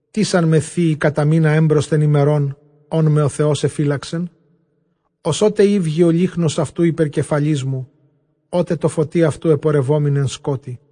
Τίς ἄν με θείη κατὰ μῆνα ἔμπροσθεν ἡμερῶν, ὧν με ὁ Θεὸς ἐφύλαξεν; Ὡς ὅτε ηὔγει ὁ λύχνος αὐτοῦ ὑπὲρ κεφαλῆς μου, ὅτε τῷ φωτὶ αὐτοῦ ἐπορευόμην ἐν σκότει·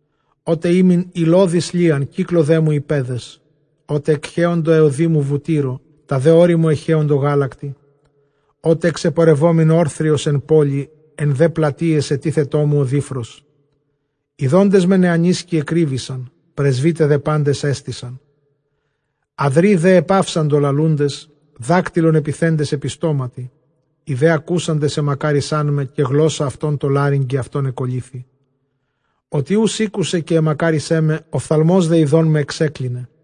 Ὅτε ἤμην ὑλώδης λίαν, κύκλῳ δέ μου οἱ παῖδες· Ὅτε ἐχέοντο αἱ ὁδοί μου βουτύρῳ, τὰ δὲ ὄρη μου ἐχέοντο γάλακτι· Ὅτε ἐξεπορευόμην ὄρθριος ἐν πόλει, ἐν δὲ πλατείαις ἐτίθετό μου ὁ δίφρος. Ἰδόντες με νεανίσκοι ἐκρύβησαν, πρεσβῦται δὲ πάντες ἔστησαν. Ἁδροὶ δὲ ἐπαύσαντο λαλοῦντες, δάκτυλον ἐπιθέντες ἐπὶ στόματι. Οἱ δὲ ἀκούσαντες ἐμακάρισάν με, καὶ γλῶσσα αὐτῶν τῷ λάρυγγι αὐτῶν ἐκολλήθη. Ὅτι οὖς ἤκουσε καὶ ἐμακάρισέ με, ὀφθαλμὸς δὲ ἰδών με ἐξέκλινε.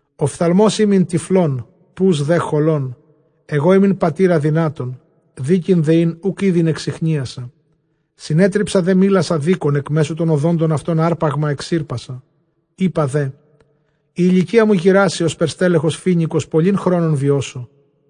Ὀφθαλμὸς ἤμην τυφλῶν, ποὺς δὲ χωλῶν. Ἐγὼ ἤμην πατὴρ ἀδυνάτων, δίκην δὲ ἣν οὐκ ᾔδειν ἐξιχνίασα. Συνέτριψα δὲ μύλας ἀδίκων, ἐκ μέσου τῶν ὀδόντων αὐτῶν ἅρπαγμα ἐξήρπασα. Εἶπα δὲ, ἡ ἡλικία μου γηράσει ὥσπερ στέλεχος φοίνικος, πολὺν χρόνον βιώσω.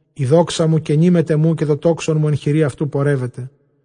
Ἡ δόξα μου κενὴ μετʼ ἐμοῦ, καὶ τὸ τόξον μου ἐν χειρὶ αὐτοῦ πορεύεται.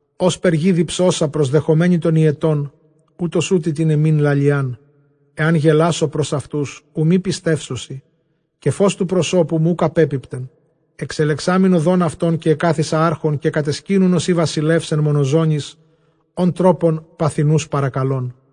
Ὥσπερ γῆ διψῶσα προσδεχομένη τὸν ὑετὸν, οὕτως οὗτοι τὴν ἐμὴν λαλιάν. Ἐὰν γελάσω πρὸς αὐτοὺς, οὐ μὴ πιστεύσωσι, καὶ φῶς τοῦ προσώπου μου οὐκ ἀπέπιπτεν. Ἐξελεξάμην ὁδὸν αὐτῶν, καὶ ἐκάθισα ἄρχων, καὶ κατεσκήνουν ὡσεὶ βασιλεὺς ἐν μονοζώνοις, ὃν τρόπον παθεινοὺς παρακαλῶν.